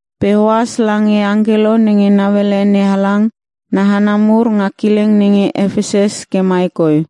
“Pe ohas lange angkelo nenge nauele NeHalang na hana mur nga kileng nenge Epesus ke mai koi: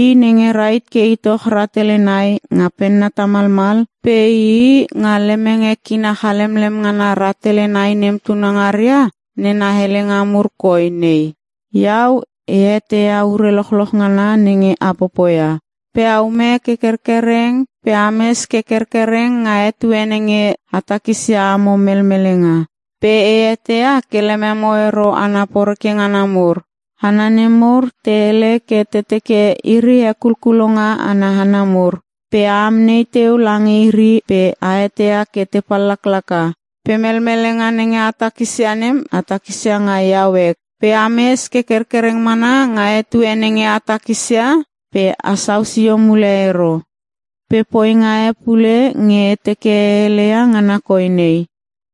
I nenge rahit ke itoch rahtele nai nga penna tamalmal pe ii nga lemenge kina chalemlem ngana rahtele nai nem tunangaria, nena helenga mur koi nei: Iau e eteia ure lochloch ngana nenge a popoia. Pe aume ke kerkereng pe ames ke kerkereng nga etue nenge a takisia amo melmelenga. Pe e eteia ke lememo ero hana poreke ngana mur. Hana nemur te hele ke te teke iri hekulkulonga ana hana mur. Pe a amnei teu lange iri pe a eteia ke te pallaklaka. Pe melmelenga nenge a takisia nem a takisia nga iau ek. Pe ames ke kerkereng mana nga etue nenge a takisia pe asau sio mule ero. Pe poinga e pule nge e teke e heleia ngana koi nei: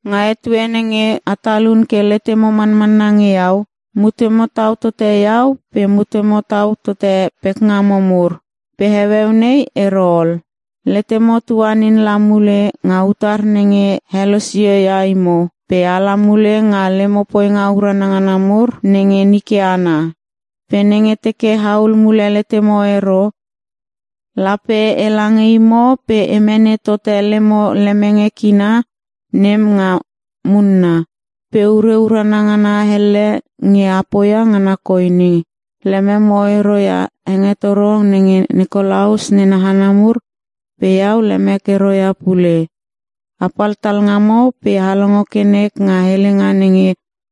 Nga etue nenge a talun ke letemo manmanna nge Iau, mutemo tau tote iau pe mutemo tau tote pekngamo mur, pe heueu nei ero ol. Letemo tuanin la mule nga utar nenge helosio ia imo pe ala mule nga lemo poinga urana ngana mur nenge nike ana. Pe nenge teke ahul mule letemo ero, lape ela nge imo pe e mene tote lemo lemenge kina nem nga munna. Pe ure urana ngana elle nge a poia ngana koi nenge: Lememo ero ia hengetoro nenge Nikolaus nena hana mur pe iau lemek ero ia pule. “Apal talngamo pe a longo ke nek nga helenga nenge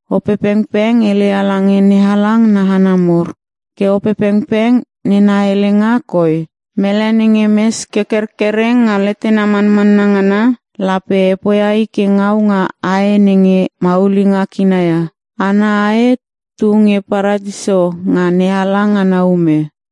Opepengpeng heleia lange NeHalang na hana mur! Ke Opepengpeng nena helenga koi, ‘Mele nenge mes ke kerkereng nga letena manmanna ngana, lape e poia i ke ngau nga ae nenge maulinga kina ia. Ana ae tunge Paratiso nga NeHalang ana ume.’”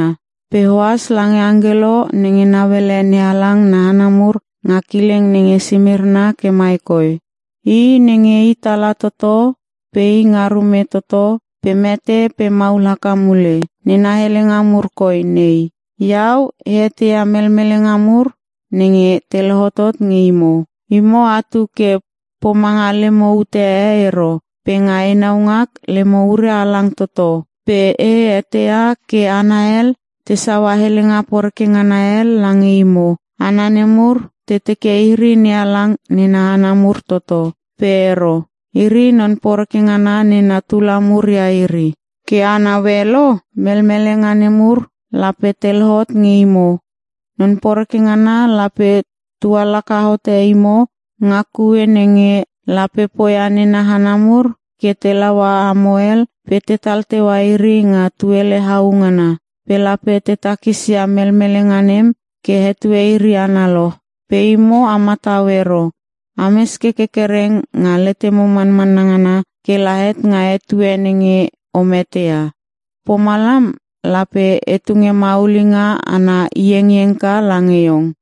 “Pe ohas lange angkelo nenge nauele NeHalang na hana mur nga kileng nenge Simirna ke mai koi: I nenge i Tala toto pe i nga Rume toto pe mete pe maul haka mule, nena helenga mur koi nei: Iau, e eteia melmelenga mur nenge te lohotot nge imo. Imo atu ke pomanga lemo ute e ero pe nga enau ngak lemo ure halang toto. Pe e eteia ke hana hel te saua helenga poreke ngana hel lange imo. Hana nemur te teke iri NeHalang nena hana mur toto, pe ero. Iri, non poreke ngana nena tula mur ia iri. Ke a naue lo? Melmelenga nemur lape te lohot nge imo. Non poreke ngana lape tualaka hote imo nga kue nenge; lape poia nena hana mur ke te laua amo hel pe tetal teua iri nga tuele au ngana. Pe lape te takis ia melmelenga nem ke etue iri analoch, pe imo a matau ero. Ames ke kerkereng nga letemo manmanna ngana kela het nga etue nenge o mete ia. Pomalam lape e tunge maulinga ana iengiengka lange iong.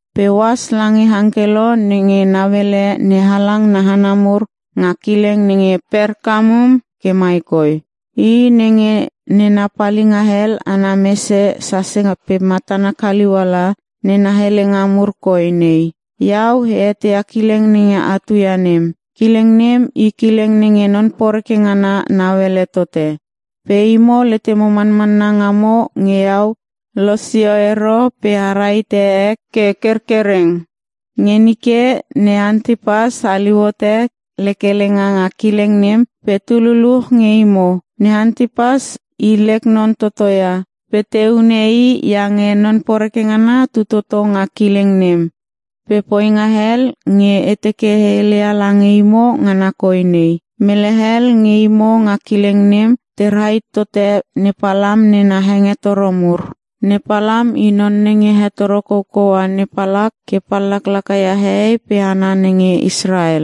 “Pe ohas lange angkelo nenge nauele NeHalang na hana mur nga kileng nenge Perkamum ke mai koi: I nenge nena palinga hel ana mese sase pe matana kaliuala, nena helenga mur koi nei: Iau e eteia kileng nenge atu ia nem. Kileng nem i kileng nenge non poreke ngana nauele tote. Pe imo letemo manmanna ngamo nge iau losio ero pe a rahite ek ke kerkereng. Nge nike ne Antipas haliu hote lek helenga nga kileng nem pe tu luluch nge imo. Ne Antipas i lek non toto ia pe te hune i iange non poreke ngana tu toto nga kileng nem. Pe poinga hel nge e teke e heleia lange imo ngana koi nei: Mele hel nge imo nga kileng nem te rahit tote ne Palam nena hengetoro mur. Ne Palam i non nenge hetoro koukoua ne Palak ke pallaklaka ia hehei pe hana nenge Israel.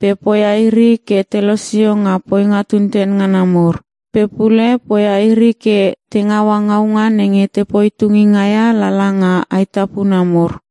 Pe poia iri ke te losio nga poinga tunten ngana mur. Pe pule poia iri ke te ngaua ngaunga nenge tepoi tunginga ia lala nga aetapuna mur.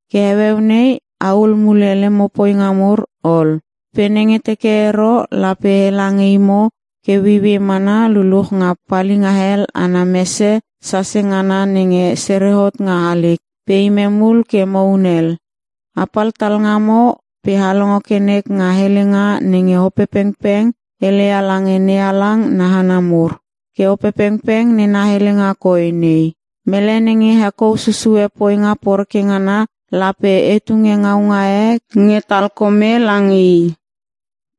Ke heueu nei ahul mule lemo poinga mur ol. Pe nenge teke ero, lape ela nge imo ke ueiuei mana luluch nga palinga hel ana mese sase ngana nenge sere hot nga halik, pe imem ul ke mo hunel. “Apal talngamo pe a longo ke nek nga helenga nenge Opepengpeng heleia lange NeHalang na hana mur! Ke Opepengpeng nena helenga koi nei: Mele nenge hekou susue poinga poreke ngana lape e tunge ngaunga e nge talkome lange i.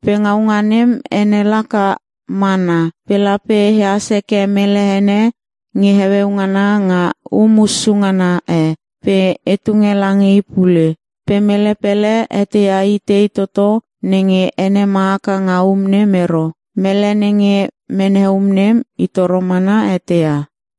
Pe ngaunga nem ene laka, ‘mana’. Pe lape ehas heke mele ene nge heueu ngana nga um hussu ngana e pe e tunge lange i pule. Pe mele pele eteia i tei toto nenge ene ma haka nga um nem ero. Mele nenge mene um nem, i toro mana eteia.”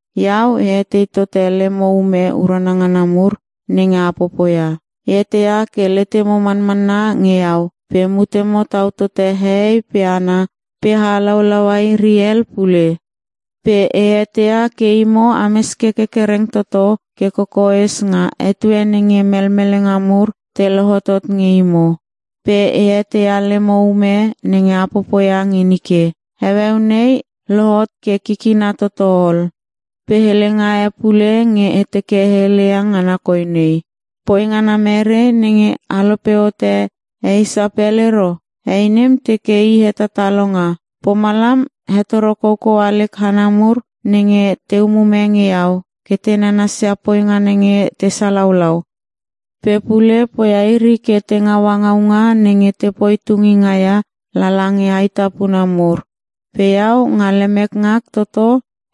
Iau e etei tote lemo ume urana ngana mur nenge a popoia. E eteia ke letemo manmanna nge iau pe mutemo tau tote hehei pe hana pe a halaulaua iri hel pule. Pe e eteia ke imo ames ke kerkereng toto ke kokoes nga etue nenge melmelenga mur te lohotot nge imo. Pe e eteia ke lemo ume nenge a popoia nge nike, heueu nei lohot ke kikina toto ol. Pe helenga e pule nge e teke e heleia ngana koi nei: Poi ngana merei nenge a lope hote he Isapel ero? Hei nem teke i hetatalonga. Pomalam hetoro koukoua lek hana mur nenge te umume nge iau ke te nanasia poinga nenge te salaulau. Pe pule poia iri ke te ngaua ngaunga nenge tepoi tunginga ia lala nge aetapuna mur. Pe iau nga lemek ngak toto,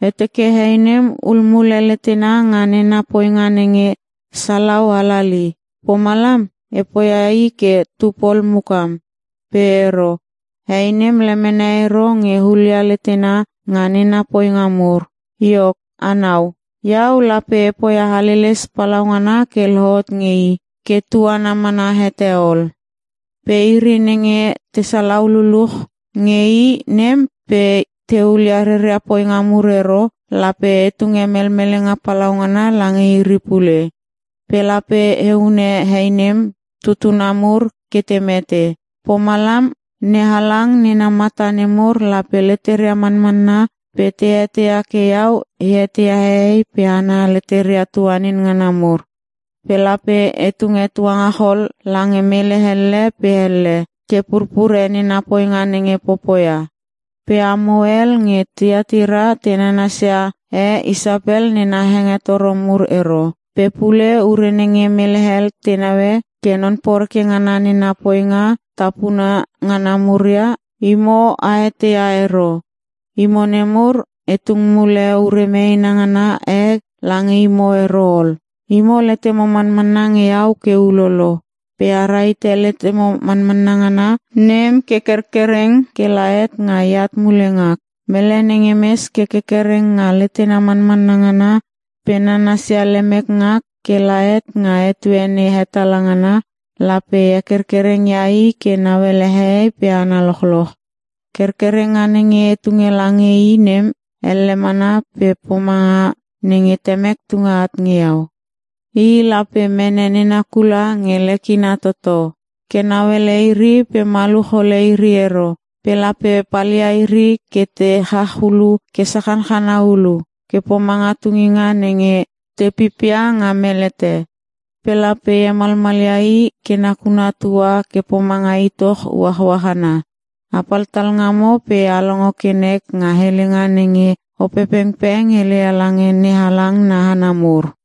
e teke hei nem hul mule letena nga nena poinga nenge salau halali. Pomalam, e poia i ke tupol mukam. Pe ero. Hei nem lemene ero nge hulia letena nga nena poinga nemur. Iok anau, Iau lape e poia haleles palaungana ke lohot nge i ke tuana mana hete ol. Pe iri nenge te salau lululuch nge hei nem pe te hulia reria poinga mur ero, lape e tunge melmelenga palaungana lange iri pule. Pe lape e hune hei nem tutuna mur ke te mete. Pomalam NeHalang nena mata nemur lape leteria manmanna pe te eteia ke iau e eteia hehei pe hana leteria tuanin ngana mur. Pe lape e tunge tuangachol lange mele elle pe elle ke purpure nena poinga nenge popoia. Pe amo hel nge Tiatira te nanasia he Isapel nena hengetoro mur ero. Pe pule ure nenge mele hel te naue ke non poreke ngana nena poinga tapuna ngana mur ia, imo a eteia ero. Imo nemur, e tung mule ure meena ngana e lange imo ero ol. Imo letemo manmanna nge Iau ke ulolo. Pe a rahite letemo manmanna ngana nem ke kerkereng kela het nga eat mule ngak. Mele nenge mes ke kerkereng nga letena manmanna ngana pe nanasia lemek ngak kela het nga etue nei hetala ngana, lape e hekerkereng ia i ke nauele hehei pe hana lochloch. “‘Kerkerenga nenge e tunge lange i nem, elle mana ke pomanga nenge Temek tunge at nge iau. I lape mene nena kula nge lekina toto ke nauele iri pe maluch hole iri ero. Pe lape palia iri ke te chach ulu ke sachanchana hulu ke pomanga tuninga nenge te pipia nga melete. Pe lape e hemalmalia i ke nakuna tua ke pomanga itoch uachuach ana.’” “Apal talngamo pe a longo ke nek nga helenga nenge Opepengpeng heleia lange NeHalang na hana mur.”